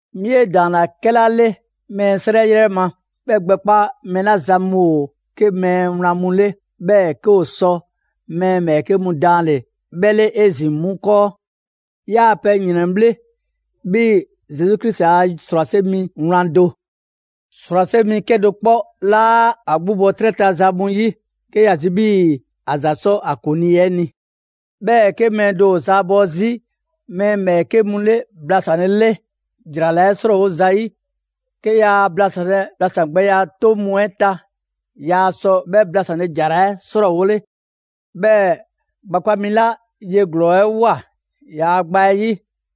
'Mi 'e ‑daanna 'kɛla 'le mɛɛ 'srɛ 'yrɛ ma, 'bhɛ gbɛkpa mɛɛ 'la zan mu ‑o 'ke mɛɛ wlan mu 'le, 'bhɛɛ‑ 'ke ‑o sɔ mɛɛ ‑bhɛɛke' mu daanle‑ 'bhɛ 'le 'ezin‑ 'mu 'kɔɔ. 'Yaa‑ pɛ ‑yrɛnbhle', 'bhii‑ Zesu Krisi a ‑srwase' mi wlan do. ‑Srwase' mi 'kedo‑ 'kpɔ 'laa ‑a 'gbu bɔ 'trɛ ta za mu 'yi, 'ke ‑ya zi 'bhii‑ ‑a ‑za 'sɔ ‑a ‑kuŋlii 'ɛ 'ni. 'Bhɛɛ‑ 'ke mɛɛ do ‑o zaabɔ 'zi mɛɛ ‑bhɛɛke' mu 'le blasanlele ‑jara 'srɔɔwo zayi', 'ke yaa blasanlɛ blasan' gbɛya 'toŋ mu 'ɛ ta, yaa sɔ 'bhɛ blasanle ‑jara 'ɛ 'srɔɔwole. 'Bhɛɛ‑ gbakpa' mi 'la ye ‑glɔɔ 'ɛ ꞊woa ‑yaa' gba 'ɛ 'yi,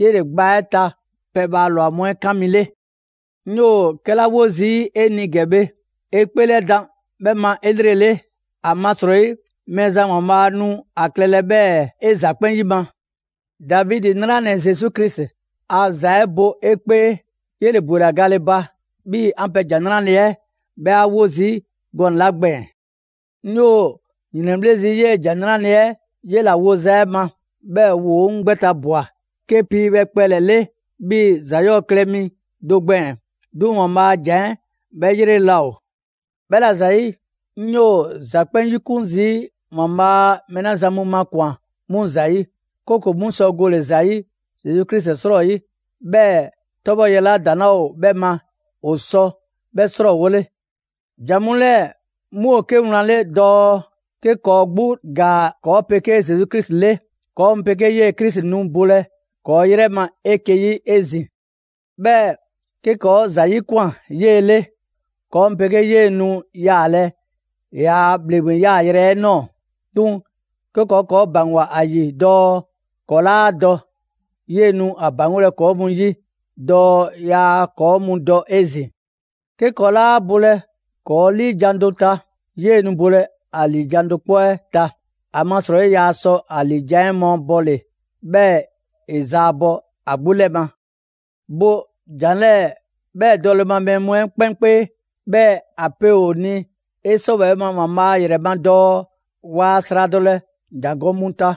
'yele‑ gba 'ɛ ta pɛbhaa ‑lwa mu 'ɛ kan mi 'le. 'Ŋ 'yoo‑ 'kɛla 'wo zii' 'e ni ‑gɛ bhe, 'e 'kpeelɛdan 'bhɛ ma 'elrele; ‑amasrɔyi Mɛɛzan ‑Waanbhaa' nu a klɛlɛ 'bhɛɛ‑ 'e ‑za 'kpɛn 'yima‑. Davidi 'nranɛ‑ Zesu Krisi a ‑za 'ɛ bo 'e 'kpee, 'yele‑ ‑bwela gale ba; 'bhii‑ 'an pɛ ‑Jan 'Nrale‑ 'ɛ 'bhɛ ‑a 'wo 'zi gɔnɛ‑ 'la gbɛɛn‑. 'Ŋ 'yoo‑ ‑yrɛnbhle' zii' 'yee‑ ‑Jan 'Nrale‑ 'ɛ 'yela‑ woza 'ɛ ma, 'bhɛɛ‑ ‑woo' 'ŋ gbɛ ta ꞊bwa 'ke piibhɛ kpɛlɛ‑ 'le 'bhii‑ ‑za 'yɔɔ‑ klɛ mi do gbɛɛn‑. 'Duŋ‑ ‑Waanbhaa' a ‑Jan 'ɛ 'bhɛ 'yrele‑ laa ‑o. 'Bhɛla‑ ‑zayi', 'ŋ 'yoo‑ ‑za 'kpɛn 'yikun zii' ‑Waanbhaa' mɛɛ mu 'la zan mu makwan‑ 'mu ‑zayi'; 'kooko‑ 'mu sɔ gole ‑za ‑yi Zesu Krisi 'srɔyi, 'bhɛɛ‑ 'tɔbhɔleya 'la ‑daŋ' 'laa ‑o 'bhɛ ma, ‑o sɔ 'bhɛ 'srɔɔwole. ‑Jan mu 'lɛɛ‑ 'mu ‑o 'ke wlan 'le dɔɔ: «'Ke ‑kɔɔ' 'gbu ‑gaa ‑kɔɔ' 'pegee Zesu Krisi 'le, ‑kɔɔ' mu 'pegee 'yee‑ Krisi nu bolɛ ‑kɔɔ' 'yrɛ ma 'eke‑ 'yi 'ezin‑. 'Bhɛɛ‑ 'ke ‑kɔɔ' ‑za 'yikwan꞊ 'yee‑ 'le, ‑kɔɔ' mu 'pegee 'yee‑ nu yaalɛ ‑yaa' ‑bhleŋgbeya yaayrɛ 'ɛ ꞊nɔɔ. 'Duŋ‑ 'ke ‑kɔɔ' ‑kɔɔ' ‑baŋgwa ‑a ‑yi dɔɔ ‑kɔɔ' 'laa dɔ, 'yee‑ nu ‑a ‑baŋgolɛ ‑kɔɔ' mu 'yi dɔɔ yaa ‑kɔɔ' mu dɔ 'ezin‑. 'Ke ‑kɔɔ' 'laa bolɛ ‑kɔɔ' 'liijan‑ do ta, 'yee‑ nu bolɛ ‑a ‑liijan' do 'kpɔ 'ɛ ta. ‑Amasrɔyi yaa sɔ ‑a ‑liijan' mabɔɔle, 'bhɛɛ‑ ‑e zaabɔ ‑a 'gbu 'lɛ ma.» Bo ‑jan 'lɛɛ‑ 'bhɛ dɔle ma mɛɛ mu 'ɛ 'kpɛn 'kpee, 'bhɛɛ‑ ‑a pe ‑o ni 'e 'sɔwɛɛ‑ ma ‑Waanbhaa' ‑yrɛ ma dɔɔ waa sradɔlɛ ‑jangɔ' mu ta.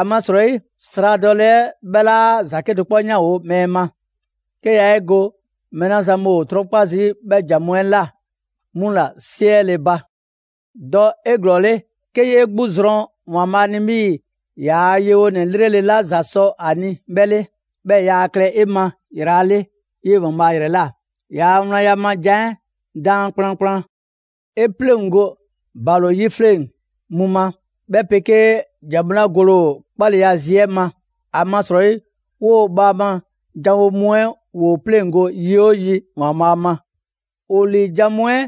‑Amasrɔyi sradɔle 'ɛ 'bhɛ 'laa ‑za 'kedo‑ 'kpɔ 'yanwo‑ mɛɛ ma, 'ke yaa 'e go mɛɛ 'la zan mu ‑o 'trɔnkpa 'bhɛ ‑jan mu 'ɛ ꞊la 'mu ‑la 'siɛle‑ ba. Dɔ 'eglɔɔle 'ke 'yee 'gbu zrɔn ‑Waanbhaa' ni 'bhii‑ ‑yaa' yewonɛ 'lrele‑ 'la ‑za sɔ a ni 'bhɛ 'le, 'bhɛɛ‑ yaa klɛ 'e ma ‑yrala' 'le 'yee‑ ‑Waanbhaa' ‑yrɛ ꞊la; ‑yaa' wlan ma ‑jan 'ɛ daan kplankplan. 'E 'pleŋgo ‑balo 'yifleŋ mu ma, 'bhɛ 'pegee ‑jan mu 'la gole ‑o 'kpaleya zi 'ɛ ma. ‑Amasrɔyi 'woo‑ bhaama janwo mu 'ɛ ‑woo 'pleŋgo‑ yi 'oo yi ‑Waanbhaa' ma. ‑O ‑liijan' mu 'ɛ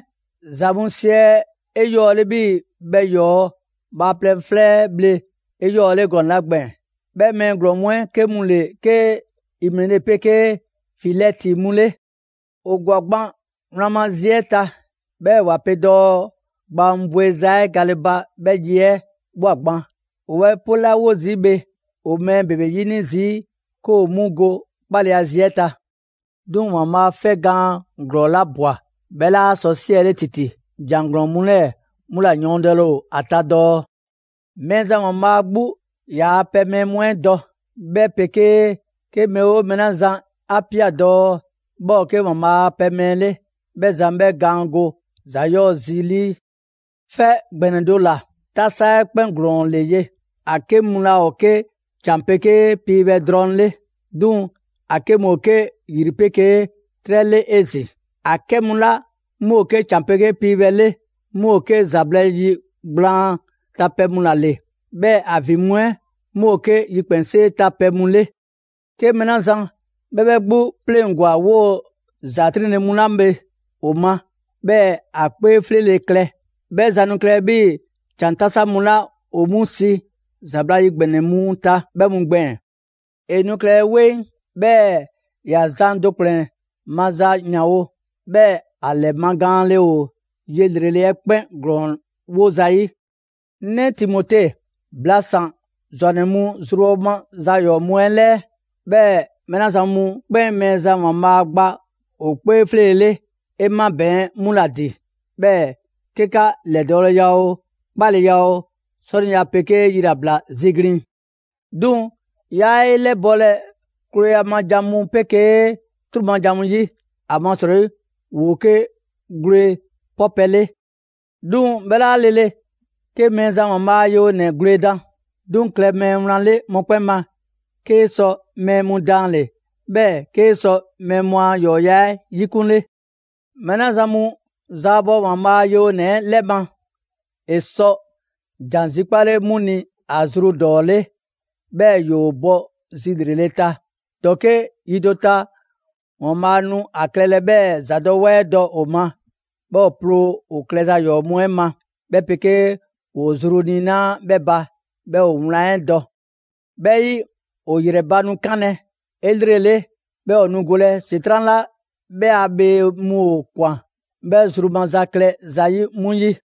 ‑za mu siɛ 'eyɔɔle 'bhii‑ bhɛ ‑yɔɔ' bhaaplɛŋ 'flɛ 'ɛ bhle 'eyɔɔle gɔnɛ‑ 'la gbɛɛn‑. 'Bhɛ mɛɛ ‑glɔɔn mu 'ɛ 'ke mu ‑le 'ke Imene 'pegee Filɛti mu 'le. ‑O ‑gwa gban wlan ma zi 'ɛ ta, 'bhɛɛ‑ ‑wa pe dɔɔ gbaa mu bweza 'ɛ gale ba 'bhɛ yi 'ɛ ꞊bhwa gban; ‑o 'bhɛ pelawo zii' bhe, ‑o mɛɛ ‑bebe 'yini zii' 'ke ‑o 'mu go 'kpaleya zi 'ɛ ta. 'Duŋ‑ ‑Waanbhaa' 'fɛgwlɛ‑ gaan ‑glɔɔla ꞊bwa, 'bhɛ 'laa sɔ 'siɛle ‑titi; ‑jan ‑glɔɔn mu 'lɛɛ‑ 'mu ‑la yɔɔndɛle ‑o ta dɔɔ: «Mɛɛzan ‑Waanbhaa' 'gbu ‑yaa' pɛ mɛɛ mu 'ɛ dɔ.» 'Bhɛ 'pegee: «'Ke mɛɛ 'oo mɛɛ 'la zan 'a ꞊pia dɔɔ 'bhɛ ‑o 'ke ‑Waanbhaa' a pɛ mɛɛ 'le, 'bhɛ zan 'bhɛ gaan go ‑za 'yɔɔ‑ zi 'lii.» 'Fɛ ‑gbɛnɛ do ‑la, 'tasa 'ɛ 'kpɛn ‑glɔɔn ‑le ye: ‑a 'ke mu laa ‑o 'ke ‑can 'pegee piibhɛ drɔŋ 'le, 'duŋ‑ ‑a 'ke mu ‑o 'ke ‑yri 'pegee 'trɛ 'le 'ezin‑. ‑A 'kɛ mu 'la 'mu ‑o 'ke ‑can 'pegee piibhɛ 'le 'mu ‑o 'ke ‑zabla' yi gblaan ta pɛ mu ‑la ‑le, 'bhɛɛ‑ ‑a ‑vin mu 'ɛ 'mu ‑o 'ke yikpɛnsee ta pɛ mu 'le. 'Ke mɛɛ 'la zan 'bhɛ 'bhɛ 'gbu 'pleŋgwa‑ 'woo‑ ‑za 'triŋle‑ mu 'la bhe ‑o ma, 'bhɛɛ‑ ‑a 'kpee 'fleele‑ klɛ. 'Bhɛ zan nu klɛlɛ 'bhii‑ ‑can 'tasa mu 'la ‑o 'mu si ‑zabla' yi ‑gbɛnɛ mu ta 'bhɛ mu gbɛɛn‑. ‑E nu klɛlɛ 'weŋ, 'bhɛɛ‑ ‑ya zan do ‑kplɛn maza ‑yanwo'; 'bhɛɛ‑ ‑a ‑lɛmagaanle ‑o ye ‑lrele' 'ɛ 'kpɛn ‑glɔɔn 'wo zayi'. 'Ŋ 'nɛ Timote, blasan‑ ‑zwannɛ mu zrubhɔ za ‑yɔɔ' mu 'ɛ 'lɛɛ. 'Bhɛɛ‑ mɛɛ 'la zan mu 'kpɛn Mɛɛzan ‑Waanbhaa' gba ‑o 'kpee 'fleele‑ 'le, 'e 'mabɛɛn‑ 'mu ‑la ‑din, 'bhɛɛ‑ 'ke 'ka ‑lɛdɔɔleya oo, 'kpaleya oo, 'sɔniya 'pegee yilabla ziglin‑. 'Duŋ‑ 'yaa 'e 'lɛbɔlɛ klooya ma ‑jan mu 'pegee 'truu‑ ma ‑jan mu 'yi, ‑amasrɔyi ‑woo 'ke gwle 'pɔpɛ‑ 'le. 'Duŋ‑ 'bhɛ 'laa lele 'ke Mɛɛzan ‑Waanbhaa' a yewonɛ gwledan. 'Duŋ‑ klɛ mɛɛ wlan 'le mɔkpɛn' ma, 'kee‑ sɔ mɛɛ mu daanle, 'bhɛɛ‑ 'kee‑ sɔ mɛɛ mu a ‑yɔɔya' 'ɛ 'yikunle. Mɛɛ 'la zan mu zaabɔ ‑Waanbhaa' ‑a yewonɛ 'ɛ 'lɛ ma, ‑e 'sɔ ‑jan zikpale 'mu ni ‑a zru ‑dɔɔ 'le, 'bhɛɛ‑ ‑yoo bɔ zi ‑lrele' ta; ‑dɔke' yi do ta, ‑Waanbhaa' nu ‑a klɛlɛ 'bhɛɛ‑ ‑zadɔwɛɛ dɔ ‑o ma, 'bhɛɛ‑ ‑o ploo ‑o klɛza ‑yɔɔ' mu 'ɛ ma, 'bhɛ 'pegee ‑woo zru niinaa' 'bhɛ ba, 'bhɛɛ‑ ‑o wlan 'ɛ dɔ. 'Bhɛ 'yi, ‑o ‑yrɛ ba nu 'kanlɛ‑ 'elrele, 'bhɛɛ ‑o nu golɛ ‑Setran' 'la 'bhɛ a bhee mu ‑o ‑kwan 'bhɛ zru maza klɛ zayi' 'mu 'yi.